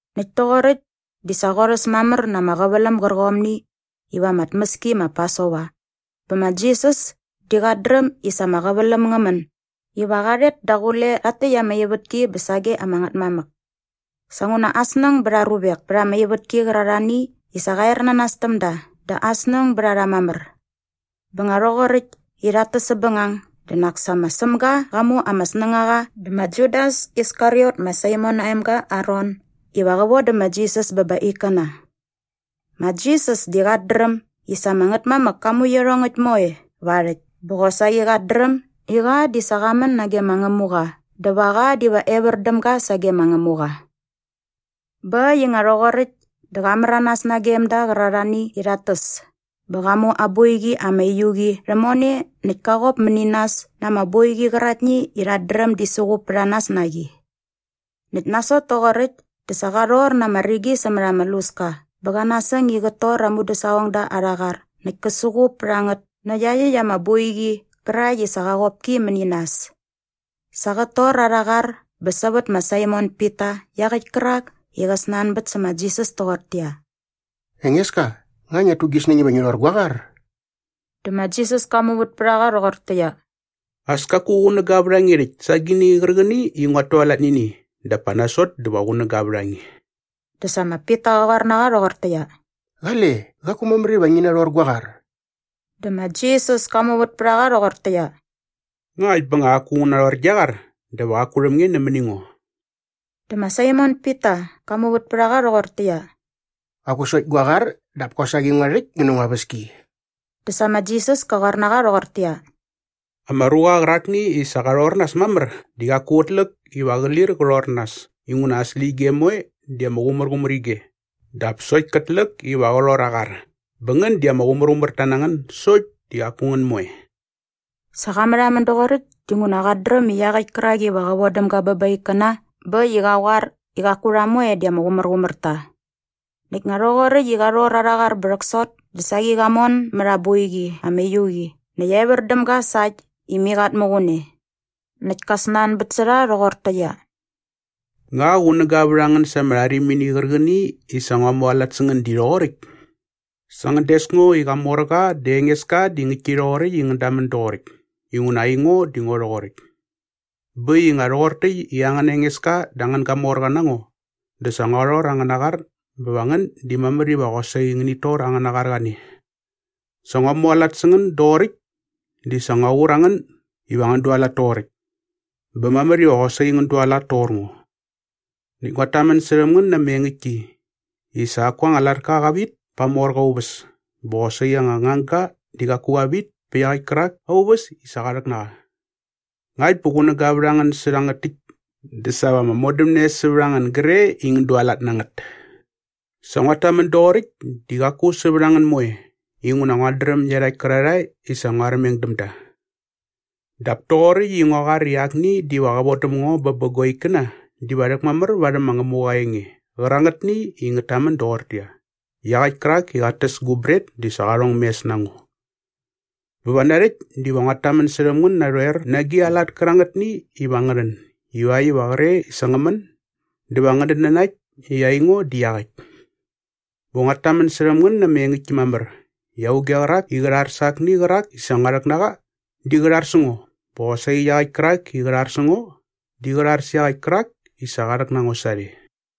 Näkt toqoräkt di sa qorhäs mamär na ama qäväläm gärqomni iva ama tmäski ma Pasova bä ma Jisas di qat dräm i sa ama qäväläm ngä män iva qa rhet daqule rhakt täkt ama ivätki bä sage ama Ngätmamäk. Sa nguna aa snäng bät aa ruvek pät ama ivätki qärarhani i sa qa ernanas täm da dä aa snäng bät a rha mamär. Bä nga rhoqoräkt i rhat täs säpbängang dä nak sa ma Sämga qa mu ama snängaqa dä ma Judas Iskariot ma Saimon aa emga aa ron iva qä vodä ma Jisas bä ba aa ikkäna. Ma Jisas di qat dräm i sa ama Ngätmamäk ka mu iarhongäkt moe va aa rhäkt bä qosaqi qat dräm i qa di sa qa män nage ma Ngämuqa dä va qa diva evär däm ga sage ma Ngämuqa Bä äkt i nga rhoqoräkt dä qa märanas nagem da qärarhani i rhat täs bä qa mu aa boiqi ama uiu qi rhämone näkt ka qop mäni nas na ama boiqi qäraktni i rhat dräm di suqup pät a nas na qi. Näkt nasot toqoräkt dä sa qa rhor na ama rigi sämät ama luska bä qa nasäng i qät tor aa mudäsaqongda arha qar näkt kä suqup pät a ngät nä iaqyäkt ama boiqi qärakt i sa qa qop ki mäni nas. Sa qät tor arha qar bä sävät ma Saimon Pita iaqäkt kärak i qa snanbät sä ma Jisas toqortäqyia, “Engeska, nga ngiat tu gi snäng iva ngi rhor gua qar?” Dä ma Jisas ka muvät pät a qa rhoqortäqyia, “As kaku qunäga vät a nge rhäkt sa agini qärqäni i nguat tualat nä ini dap pa nasot dä va qunäga vät a nge.” Dä sa ma Pita qa qoar na qa rhoqortäqyia, “Qale, qaku mamär iva ngi narhor gua qar.” Dä ma Jisas ka muvät pät a qa rhoqortäqyia, “Ngakt bä nga qaku ngu narhor gia qar dä va qaku rhäm nge nämäni ngo.” Dä ma Saimon Pita qa muvät pät a qa rhoqortäqyia, “Qaku sokt gua qar dap kosaqi ngua rhäkt ngä nä ngua väski!” Dä sa ma Jisas ka qoar na qa rhoqortäqyia, “Ama ruqa qärakni i sa qa rhor nas mamär di qaku qät läk iva qä lir qä rhor nas inguna aa släqyige moe di ama qumärqumär ige dap sokt kät läk iva qä rhor aa qar. Bä ngän di ama qumärqumärta na ngän sokt di qaku ngän moe.” Sa qa märhamän doqoräkt dinguna qat dräm i iaqäkt kärak iva qä vodäm ga bä ba aa ikkäna bä äkt i qa qoar i qaku rha moe di ama qumärqumär ta. Näkt nga rhoqoräkt i qa rhor arha qar bä rhäksot dä saqi qa mon mät aa boiqi ama uiu qi näkt evär däm ga sa äkt i mai qat muqun e. Näkt ka snanbät sä rha rhoqortäqyia, “Nga qunäga vät a ngän sa ama rharimini qärqäni i sa ngua mualat sä ngän di rhoqoräkt?” Bä ngän des ngo i Qamorqa dä Engeska di ngäktki rhoqoräkt i ngän damän doqoräkt inguna aingo di ngo rhoqoräkt. Bä äkt i nga rhoqor täkt i angäna Engeska dä angän gamorqa na ngo dä sa ngua rhor angäna qar bä va ngän di mamär iva qosaqi ngänit tor angäna qar qane. Sa ngua mualat sä ngän doqoräkt di sa ngur qur a ngän iva ngän dualat toqoräkt. Bä mamär iva qosaqi ngän dualat toqor ngo. Näkt nguat tamän särhäm ngän na ama engäktki i sa qaku anga latka qa vit pa aa morqa aa uväs bä qosaqi anga ngangga di qaku qa vit pa iaqäkt kärak aa uväs i sa qa rhäk na qa. Ngakt bä qunäga vät a ngän sä rhangät täkt dä sa va ama modämne sävät a ngän gre i ngän dualat na ngät. “Sa nguat tamän doqoräkt di qaku sävät a ngän moe inguna nguat dräm iarhakt kärarhae i sa ngua armeng däm da. Dap toqoräkt i ngua qoar i akni diva qä vodäm ngo bä bä gua ikkäna diva rhäkmamär varhäm ma Ngämuqa aa enge qärangätni i ngät tamän doqortäqyia, ‘Iaqäkt kärak i qat täs gu bret di sa qa rhong mes na ngo.’ Bä va narhäkt diva nguat tamän särhäm ngän narhoer na agi a lat kärangätni iva ngä rhän ivakt iva qre i sa ngä män dä va ngänät nanakt i aingo di iaqäkt. Bä nguat tamän särhäm ngän na ama engäktki mamär i auge qärak i qä rhar sa akni qärak i sa ngua rhäk na qa di qä rhar sä ngo bä qosaqi iaqäkt kärak i qä rhar sä ngo di qä rhar sä iaqäkt kärak i sa qa rhäk na ngo sarhe.”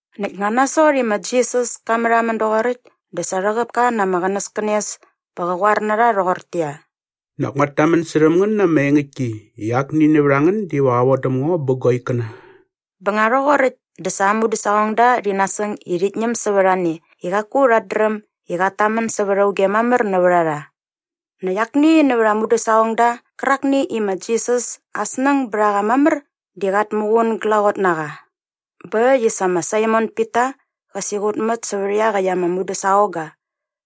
Näkt nga nasot i ma Jisas ka märhamän doqoräkt dä sa rhäqäp ka na ama qänäskänes bä qa qoar na rha rhoqortäqyia, “Nak nguat tamän särhäm ngän na ama engäktki i akni nävät a ngän diva qä vodäm ngo bä gua ikkäna.” Bä nga rhoqoräkt dä sa aa mudäsaqongda rhi nasäng i rhit ñäm sävät a ne i qaku rhat dräm i qat tamän sävät auge mamär nävät a rha. Näkt akni nävät ama mudäsaqongda qärakni i ma Jisas aa snäng bät a qa mamär di sa qat muqun glaqot na qa. Bä äkt i sa ma Saimon Pita qa siqutmät sävät iaqäkt ama mudäsaqongga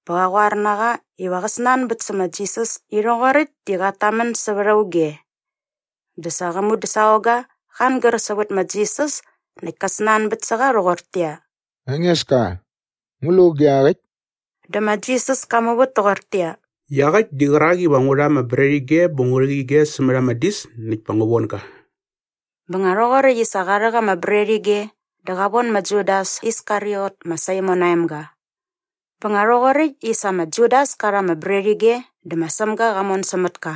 bä qa qoar na qa iva qä snanbät sä ma Jisas i rhoqoräkt di qat tamän sävät auge. Dä sa qä mudäsaqongga qa angär sävät ma Jisas näkt ka snanbät sä qa rhoqortäqyia, “Engeska, ngu lu auge iaqäkt?” Dä ma Jisas ka muvät toqortäqyia, “Iaqäkt di qärak iva ngu rha ama bretige bä ngu rhäk ige sämät ama dis näkt pa ngu von ga.” Bä nga rhoqoräkt i sa qa rhäk ama bretige dä qa von ma Judas Iskariot ma Saimon aa emga. Bä nga rhoqoräkt i sa ma Judas ka rha ama bretige dä ma Sämga qa mon sämät ka.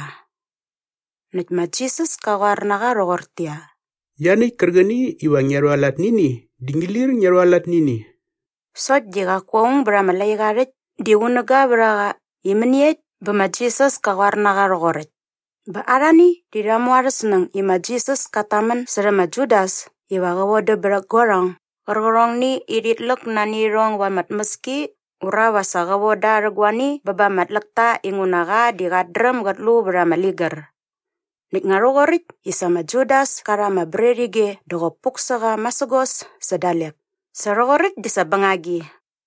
Näkt ma Jisas ka qoar na qa rhoqortäqyia, “Ianiäkt kärqäni iva ngia rhualat nä ini di ngi lir ngia rhualat nä ini.” Sokt di qaku aung bät ama laiqa aa rhäkt di qunäga vät a qa i mäniekt bä ma Jisas ka qoar na qa rhoqoräkt. Bä arhani di rha mu arhä snäng i ma Jisas kat tamän särhä ma Judas iva qä vodäm bät guarhong gärqärhongni i rhit läk nani irhong ba ama tmäski ura va sa qa von da rhä guani bä ba ama tläkta inguna qa di qat dräm gät lu vät ama ligär. Näkt nga rhoqoräkt i sa ma Judas ka rha ama bretige dä qop puk sä qa masägos sä dalek. Sa rhoqoräkt di sa bängagi.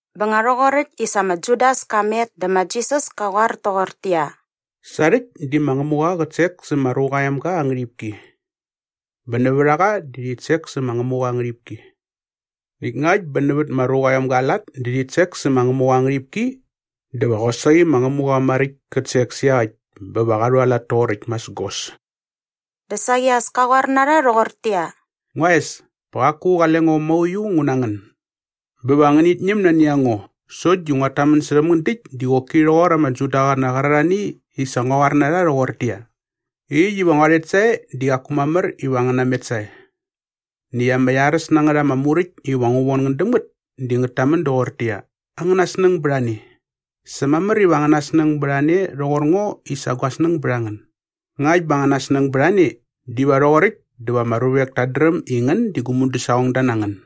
Bä nga rhoqoräkt i sa ma Judas ka met dä ma Jisas ka qoar toqortäqyia, “Sa rhäkt di ma Ngämuqa qät sek sä ma Ruqa aa Emga aa ngärhipki. Bä nävät a qa di rhit sek sä ma Ngämuqa aa ngärhipki. Näkt ngakt bä nävät ma Ruqa aa Emga aa lat di rhit sek sä ma Ngämuqa aa ngärhipki dä va qosaqi ma Ngämuqa maräkt kät sek sä iaqäkt bä va qa rhualat toqoräkt masägos.” Dä saqi as ka qoar na rha rhoqortäqyia, “Ngua es, pa qaku qale ngo mauiu ngu na ngän. Bä va ngänit ñäm nani a ngo sokt di nguat tamän särhäm ngän däkt di qoki rhoqor ama Judaqäna qärarhani i sa ngua qoar na rha rhoqortäqyia, ‘Äkt iva ngua rhet sae di qaku mamär iva ngän namet sae.’ Näkt ama iaräs na ngät ama muräkt iva ngu von ngän däm ngät di ngät tamän doqortäqyia, ‘Angäna snäng bät a ne. Sa mamär iva angäna snäng bät a ne rhoqor ngo i sa gua snäng bät a ngän.’ Ngakt bä angäna snäng bät a ne diva rhoqoräkt dä va ama ruvek tat dräm i ngän di gu mudäsaqongda na ngän.”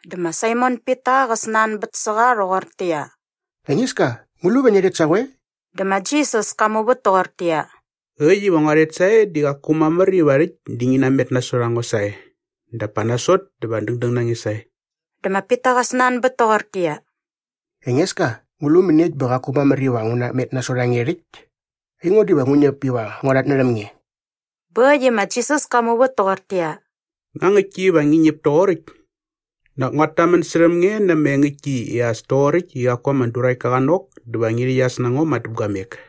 Dä ma Saimon Pita qa snanbät sä qa rhoqortäqyia, “Engeska, ngu lu va ngia rhet sa qoe?” Dä ma Jisas ka muvät toqortäqyia, “Äkt iva ngua rhet sae di qaku mamär iva rhäkt di ngi namet nasot a ngo sae dap pa nasot dä va dängdäng na nge sae.” Dä ma Pita qa snanbät toqortäqyia, “Engeska, ngu lu mäniekt bä qaku mamär iva ngu namet nasot a nge rhäkt? Aingo diva ngu ñäp iva ngua rhatnärhäm nge.” Bä äkt i ma Jisas ka muvät toqortäqyia, “Nga ngäktki iva ngi ñäp toqoräkt? Nak nguat tamän särhäm nge na ama engäktki i as toqoräkt i qaku ama duräktka qa nok dä va ngi rhäqyas na ngo madäpguamek!”